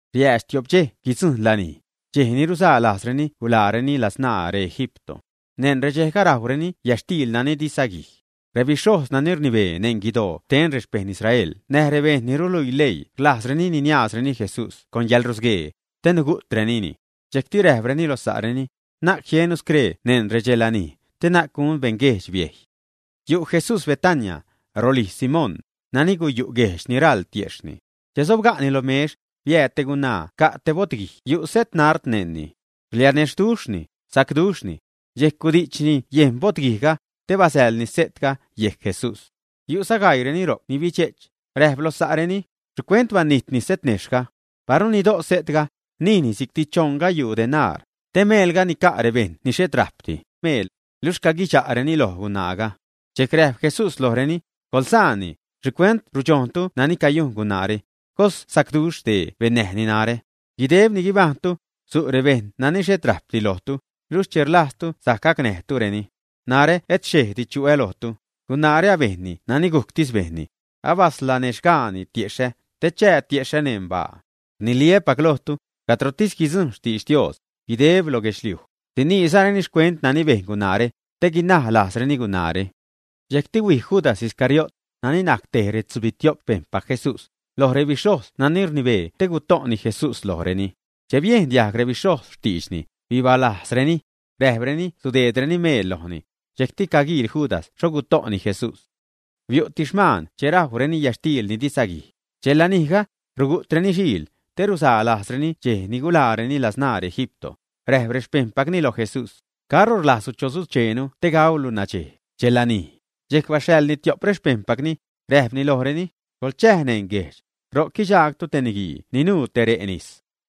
Riäädx tiop dxej guidzujṉ lanij, dxej ni ruzaa lajzreni guḻaareni ladzṉaa reEgipto. Neṉ redxejga rajwreni yätxtiil nani di saguij. Rebixhojz nani rnibee neṉ guidoo xten rexpejṉ Israel näj rebejṉ ni ruluii leii rlajzreni niniaazreni Jesús con yäḻrusguee, te nugu'trenini. Dxejcti räjpreni lo sa'reni: ―Na'c jiennu scree neṉ redxelanij, te na'c gun beṉguejdx biejy. Yu' Jesús Betania, rolijz Simón, nani guyu' guejch ni raḻ tiejxhni. Che sobga'ni lo mex, biääd te gunaa ca' te bo'tguij yu' setnard neṉni. Rlianexhduxhni, sacduxhni. Dxejc gudi'chni yejn bo'tguijga, te basäḻni se'tga yejc Jesús. Yu'za gaiireni ro'c ni bidxe'ch, räjp loj sa'reni: ―¿Xhicuent banijtni setnejxhga? Paru nido' se'tga, nijni si'cti choṉ gayuu denar, te nica' meelga rebejṉ ni xhet rajpdi meel. Luxh caguidxa'reni loj gunaaga. Dxejc räjp Jesús lojreni: ―Coḻsaanni, ¿xhicuent rudxojntu nani cayujn gunaare? Cos sacduxh dee bennäjni narä. Guideb ni guibajṉtu, su' rebejṉ nani xhet rajpdi lojtu, luxh che rlajztu sajc gacnäjtureni. Narä et xchejdi chu'ä lojtu. Gunaare abejnni nani gujctis bejnni. Abaslanexhxgaani tiexhä, te chää tiexhä neṉ baa. Rniliä́pac lojtu, cadrotis guidzujṉ xtidx Dios, guideb lo guedxliuj, siniizareni xcuent nani bejn gunaare, te guinaj lajzreni gunaare. Dxejcti huij Judas Iscariot, nani najc tej retzubitio'p xpejṉpac Jesús, loj rebixhojz nani rnibee te guto'ni Jesús lojreni. Che biejn diajg rebixhojz xtiidxni, bibalajzreni. Räjpreni sudeedreni meel lojni. Dxejcti caguiil Judas xho guto'ni Jesús. Biu'ti xmaan che rajwreni yätxtiil ni di saguij. Dxej lanijga, rugu'treni xiil, te ruzaa lajzreni dxej ni guḻaareni ladzṉaa reEgipto. Räjp rexpejṉpacni loj Jesús: ―¿Caro rlajzlu chosucheenu te gauulu nadxej, dxelanij? Dxejc baxhaḻni tiop rexpejṉpacni, räjpni lojreni: ―Coḻchäj neṉ guejdx, ro'c guidxaagtu te niguii ni nuu te re' nis.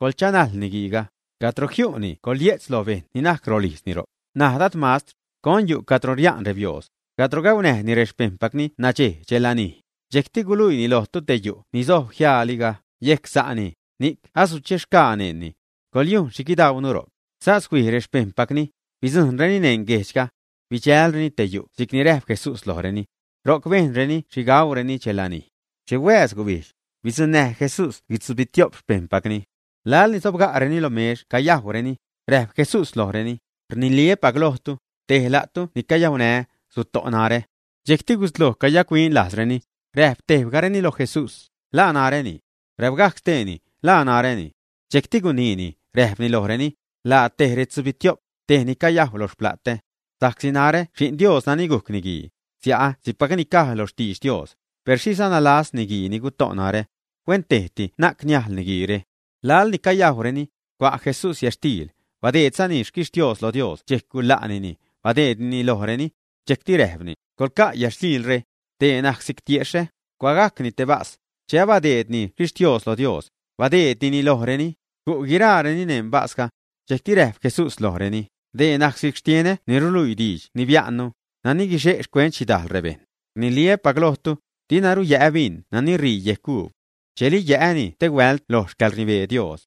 Coḻchanajl niguiiga. Cadro jiu'ni coḻye'tz loj bejṉ ni najc rolijzni ro'c: “Naj Dad mastr, ¿con yu' cadro ria'n rebiooz, cadro gaunäjni rexpejṉpacni nadxej, dxelanij?” Dxejcti guluiini lojtu te yu' ni sojb jiaaliga yejc sa'ni, ni asuchexgaa neṉni. Coḻyujn xhi guidauunu ro'c. Sas huij rexpejṉpacni, bidzujṉreni neṉ guejdxga. Bidxälreni te yu' si'cni räjp Jesús lojreni. Ro'c bejnreni xhi gudajwreni dxelanij. Che huääz gubijdx, bidzuṉnäj Jesús guitzubitio'p xpejṉpacni. Laḻni sobga'reni lo mex cayajwreni, räjp Jesús lojreni: ―Rniliä́pac lojtu, tej la'tu ni cayaunää́, suto'ni narä. Dxejcti gusloj cayac-huin lajzreni, räjp tebgajreni lo Jesús: ―¿La naräni? Räpgajc steeni: ―¿La naräni? Dxejcti guniini, räjpni lojreni: ―La tej retzubitio'p, tej ni cayajw loj xpla'tä. Sa'csi narä Xi'n Dios nani gujc Niguii, sia'ä, si'cpacni caj loj xtiidx Dios, per xhiza nalajz niguii ni guto' narä. Huentejti na'c niajl niguiire. Laḻni cayajwreni, cua' Jesús yätxtiil, badeedzani xquixhtiooz loj Dios dxejc guḻa'nini, badeednini lojreni. Dxejcti räjpni: ―Coḻca' yätxtiilre. Dee najc si'c tiexhä. Cuagajcni te bas. Che abadeedni xquixhtiooz loj Dios, badeednini lojreni, gu' guiraareni neṉ basga. Dxejcti räjp Jesús lojreni: ―Dee najc si'c xtienä ni ruluii diidx ni biä'nnu, nani guixe' xcuent xhidajl rebejṉ. Rniliä́pac lojtu, diruna yä'ä bin nani ṟii yejc uub, dxejli yä'äni stehuält loj xcäḻrnibee Dios.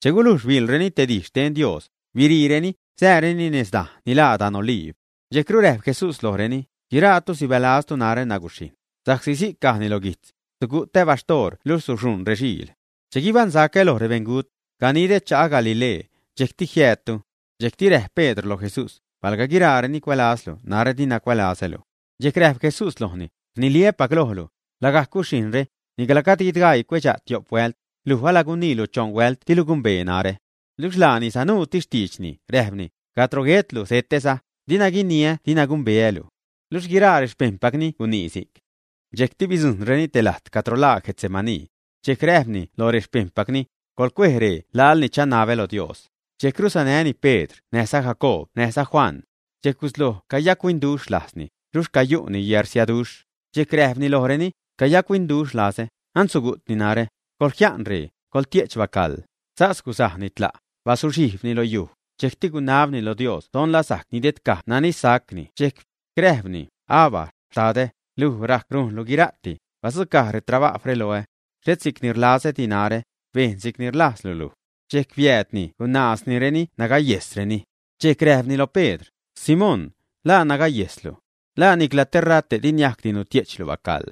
Che gulujx biḻreni te dij xten Dios, biriireni, sääreni nez dajne' ni laa dan Oliib. Dxejcru räjp Jesús lojreni: ―Guiraatu sibälaztu narä naguxhijṉ, sa'csi si'c cajni lo guijtz: “Sugu'tä baxhtoor luxh suxuṉ rexiil.” Che guibaṉsacä loj rebeṉgut, ganidä cha'a Galilee, dxejcti jiäädtu. Dxejc räjp Pedr loj Jesús: ―Palga guiraareni cuälazlu, narä dina cuälazälu. Dxejc räjp Jesús lojni: ―Rniliä́pac lojlu, lagajc guxhijṉre, nicla gajd guidgaii cuedxa' tiop huält, luj aguiniilu choṉ huält dilu gumbee narä. Luxh laani sanuutis xtiidxni, räjpni: ―Cadro guetlu setäza, dina guiniä dina gumbeälu. Luxh guiraa rexpejṉpacni gunii si'c. Dxejcti bidzujṉreni te lajt cadro laa Getsemaní. Dxejc räjpni loj rexpejṉpacni: ―Coḻcuej ree laḻni chanabä lo Dios. Dxejcru sanäni Pedr näj Jacoob näjza Juan. Dxejc gusloj cayac-huinduxh lajzni, luxh cayu'ni yäḻrsiaduxh. Dxejc räjpni lojreni: ―Cayac-huinduxh lazä, an sugu'tni narä. Coḻjia'n ree, coḻtie'ch bacaḻ. Sas gusajni tla', bazuxhijbni lo yuj, dxejcti gunabni lo Dios don la niajc nidedcaj nani sacni dxejc. Räjpni: ―Abba, xtadä, luj rajc rujnlu guira'ti: badzucaj retrabajwre loä. Xhet si'cni rlazädi narä, bejn si'cni rlajzlu luj. Dxejc biäädni gunaaznireni nagayejsreni. Dxejc räjpni lo Pedr: ―Simón, ¿la nagayejslu? ¿La nicla te rate' diniajcdi nutie'chlu bacaḻ?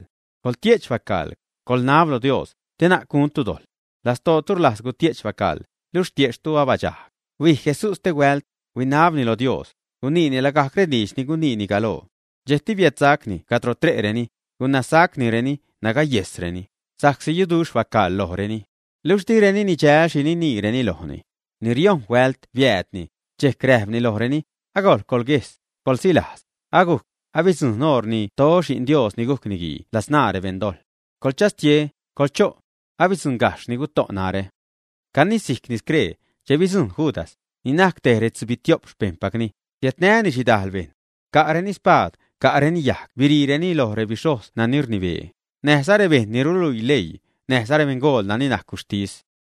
Coḻtie'ch bacaḻ, coḻnab lo Dios, te na'c guntu dojḻ. Lastootu rlajz gutie'chtu bacaḻ, luxh tiejxhtu abadxajg. Huij Jesús stehuält, binabni loj Dios, guniini lagajc rediidx ni guniini galoo. Dxejcti biädsacni cadro tre'reni, gunazsacnireni nagayejsreni, sa'csi yuduxh bacaḻ lojreni. Luxh direni nidxäl xhi niniireni lojni. Ni riojṉ huält biäädni, dxejc räjpni lojreni: ―Agojḻ coḻguejs, coḻsilajz, agujc, abidzujṉ oṟ ni ted Xi'n Dios ni gujc Niguii ladzṉaa rebeṉdojḻ. Coḻchastie, coḻcho'. Asiäddzuṉgajxh ni guto' narä. Canisijcni scree, che bidzujṉ Judas, ni najc te retzubitio'p xpejṉpacni, siädnäni xhidajl bejṉ. Ca'reni spaad, ca'reni yajg biriireni lo rebixhojz nani rnibee, näjza rebejṉ ni ruluii leii, näjza rebeṉgool nani najc guxhtis.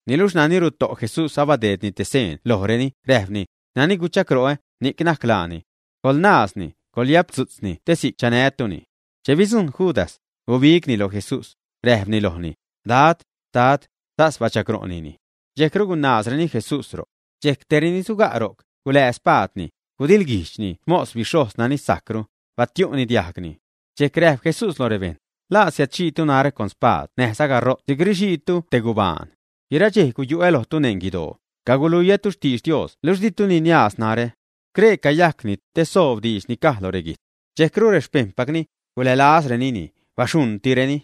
Niluxh nani ruto' Jesús abadeedni te seen lojreni, räjpni: ―Nani guchagro'ä, ni'c najc laani. Coḻnaazni, coḻyaptzu'tzni te si'c chanätuni. Che bidzujṉ Judas, gubigni loj Jesús, räjpni lojni: ―Dad, Dad. Sas bachagro'nini. Dxejcru gunaazreni Jesús ro'c. Dxejc tej reni suga' ro'c, gulää xspaadni, gudiḻguijdxni xmos bixhojz nani sajcru, batiu'ni diajgni. Dxejc räjp Jesús loj rebejṉ: ―¿La siädxhiitu narä con spaad näjza garo't si'c rixiitu te gubaan? Guiraa dxej guyu'ä lojtu neṉ guidoo, caguluiätu xtidx Dios luxh ditu niniaaztu narä. Scree cayajcni, te soob diidx ni caj lo reguijtz. Dxejcru rexpejṉpacni gulälazrenini, baxuṉtireni.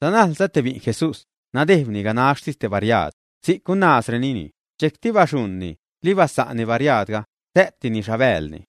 Sanajlza te bi'n Jesús, nadejbni ganaxhtis te bariaad. Si'c gunaazrenini. Dxejcti baxuṉni, libasa'nni bariaadga, sä'tini xhabäälni.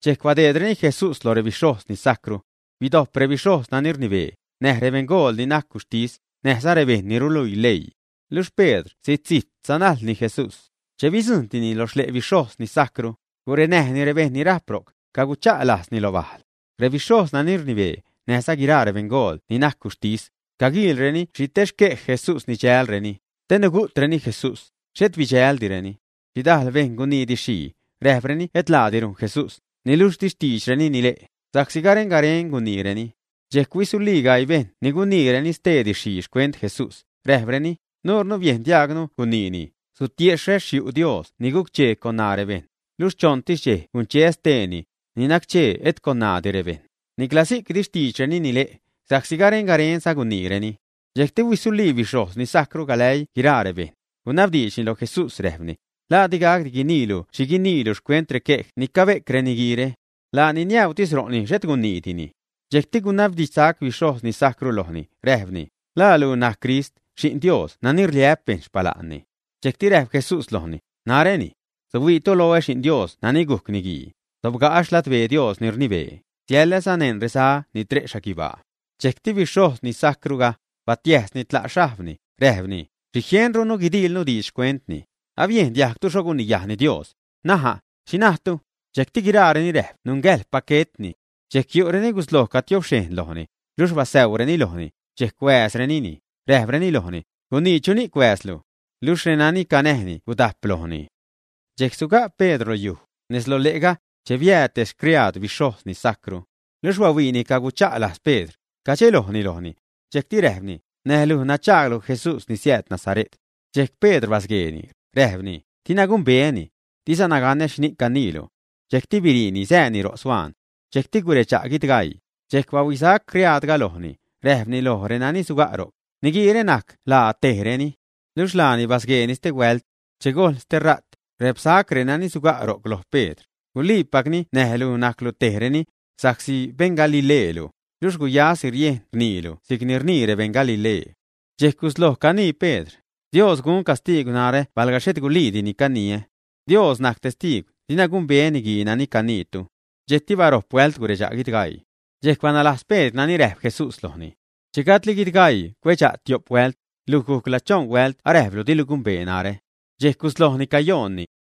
Dxejc biädnäreni Jesús loj bixhojz ni sajcru. Bidojp rebixhojz nani rnibee, näj rebeṉgool ni najc guxhtis, näjza rebejṉ ni ruluii leii. Luxh Pedr zijt zijt sanajlni Jesús. Che bidzujṉtini lo xle' bixhojz ni sajcru, gurenäjni rebejṉ nani rajp ro'c, cagucha' lajzni lo bajl. Rebixhojz nani rnibee, näjza guiraa rebeṉgool ni najc guxhtis, caguiilreni xhi tej xquej Jesús nidxälreni, te nugu'treni Jesús, xhet bidxäldireni. Xhidajl bejṉ gunii didxxhii, räjpreni et laadi rujn Jesús, niluxh di xtiidxreni nile', sa'csi garen garen guniireni. Dxejc huisulii gaii bejṉ ni guniireni stee didxxhii xcuent Jesús, räjpreni: ―Nuunu biejn diaagnu guniini: “Sutiexhä xyu' Dios ni guc-chee con ṉaa rebejṉ, luxh choṉtis dxej guncheä steeni, ni nac-chee et con ṉaadi rebejṉ.” Nicla si'c di xtiidxreni nile', sa'csi garen garenza guniireni. Dxejcti huisulii bixhojz ni sajcru galäii guiraa rebejṉ, gunabdiidxni loj Jesús räjpni: ―¿La digacdi guiniilu xhi guiniilu xcuent requej ni cabe'c reniguiire, ä? Laani niäuutis ro'ni, xhet guniidini. Dxejcti gunabdidxsac bixhojz ni sajcru lojni, räjpni: ―¿La luj ni najc Crist, xi'n Dios nani rliä'p bejṉ xpala'nni, ä? Dxejcti räjp Jesús lojni: ―Naräni. Suhuiitu loä, Xi'n Dios nani gujc Niguii, sobga'ä xladbee Dios ni rnibee, siäläza neṉ reza ni tre' xhaguibaa. Dxejcru bixhojz ni sajcruga, batiäjsni tla' xhajbni, räjpni: ―¿Xhi jienrunu guidiilnu diidx xcuentni? Abiejn diajgtu xho guniyajni Dios. N̲aja', ¿xhi najtu? Dxejcti guiraareni räjp nungäjḻpac guetni. Dxejc yu' reni gusloj cagutiobxhejn lojni, luxh basäuureni lojni, dxejc huääzrenini, räjpreni lojni: ―Gunii, ¿chuni'c huääzlu? Luxh renani canäjni gudajp lojni. Dxejc suga' Pedr lo yuj, nez lo le'ga, che biääd te xcriaad bixhojz ni sajcru. Luxh bahuiini cagucha' lajz Pedr, cadxelojni lojni. Dxejcti räjpni: ―Näj luj nadxaaglu Jesús ni siääd Nazare't. Dxejc Pedr basgueeni, räjpni: ―Dina gumbeäni. Dizana ganä xhini'c caniilu. Dxejcti biriini sääni ro' suaan. Dxejcti guredxa' guidgaii. Dxejc bahuisac criaadga lojni, räjpni loj renani suga' ro'c: ―Niguiire najc laa tejreni. Luxh laani basgueeni stehuält. Che gojl stera't, räpsac renani suga' ro'c loj Pedr: ―Guliipacni näj luj najclu tejreni, sa'csi beṉ Galileelu, luxh guyasi riejn rniilu si'c rnii rebeṉ Galilee. Dxejc gusloj canii Pedr: ―Dios gun castiigw narä palga xhet guliidi ni caniä. Dios najc testiigw, dina gumbeä niguii nani caniitu. Dxejcti barojp huält guredxa' guidgaii. Dxejc banalajz Pedr nani räjp Jesús lojni: “Che gajdli guidgaii cuedxa' tiop huält, luj gacla choṉ huält aräjplu dilu gumbee narä.” Dxejc guslojni cayoonni.